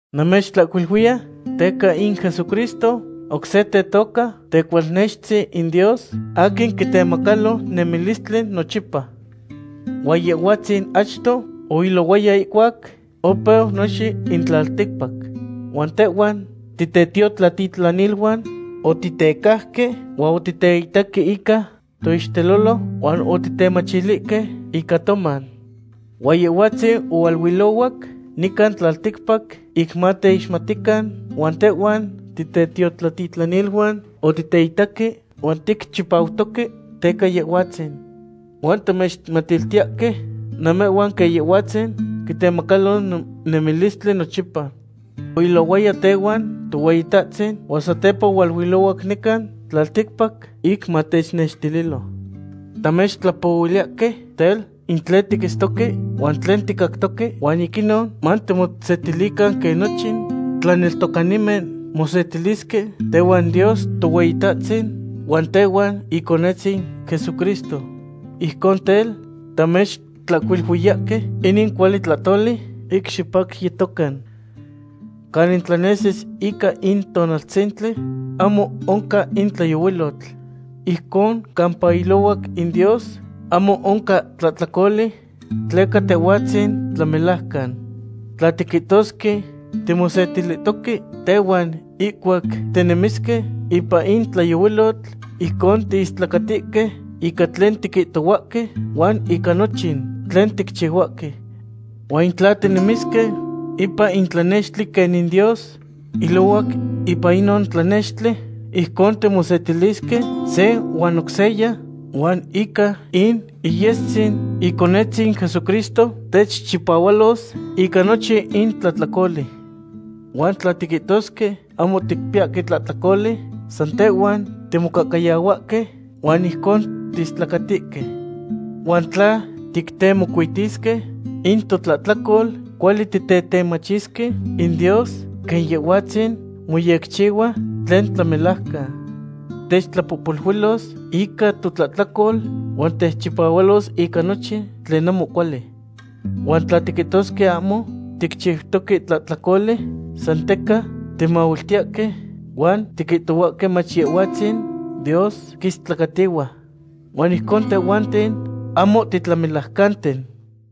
Namechtlahcuiluiya teca in Jesucristo oc se tetoca Tecualnextzin in Dios aquin quitemacalo nemilistli nochipa. Huan Yehhuatzin achto oilohuaya ihcuac opeu nochin in tlalticpac. Huan tehhuan titetiotlatitlaniluan otitecajque huan otiteitaque ica toixtelolo huan otitemachilihque ica toman. Huan Yehhuatzin ohualuilohuac nican tlalticpac ic mateixmatican huan tehhuan titetlatitlaniluan otiteitaque, huan ticchipautoque teca Yehhuatzin. Huan tamechmatiltiyahque namehhuan quen Yehhuatzin quitemacalo nemilistli nochipa. Oilohuaya tehuan Tohueyitahtzin huan satepa ohualuilohuac nican tlalticpac ic matechnextililo. Tamechtlapohuiliyahque tel, in tlen tiquitztoque huan tlen ticactoque, huan ic inon matimosetilican quen nochin tlaneltocanimen mosetilisque tehuan Dios Tohueyitahtzin huan tehuan Iconetzin Jesucristo. Ijcon tel, tamechtlahcuiluiyahque inin cuali tlahtoli ic xipacyetocan. Canin tlanesis ica in tonaltzintli ahmo oncan in tlayohuilotl. Ijcon campa ilohuac in Dios ahmo oncan tlahtlacoli tleca Tehhuatzin tlamelajcan. Tla tiquihtosque timosetilihtoque tehuan ihcuac tinemisque ipan in tlayohuilotl, ijcon tiistlacatihque ica tlen tiquihtohuahque huan ica nochin tlen ticchihuahque. Huan in tla tinemisque ipan in tlanextli quenin Dios ilohuac ipan inon tlanextli, ijcon timosetilisque se huan oc seya, huan ica in iyestzin Iconetzin Jesucristo techchipahualos ica nochin in tlahtlacoli. Huan tla tiquihtosque ahmo ticpiyahque tlahtlacoli, san tehhuan timocahcayahuahque huan ijcon tiistlacatihque. Huan tla tictemocuitisque in totlahtlacol, cuali titetemachisque in Dios quen Yehhuahtzin moyecchihua tlen tlamelajcan. Techtlapohpoluilos ica totlahtlacol huan techchipahualos ica nochin tlen ahmo cuali. Huan tla tiquihtosque ahmo ticchiutoque tlahtlacoli, san teca timahuiltiyahque huan tiquihtohuahque mach Yehhuatzin Dios quistlacatihua. Huan ijcon tehhuanten ahmo titlamelajcanten.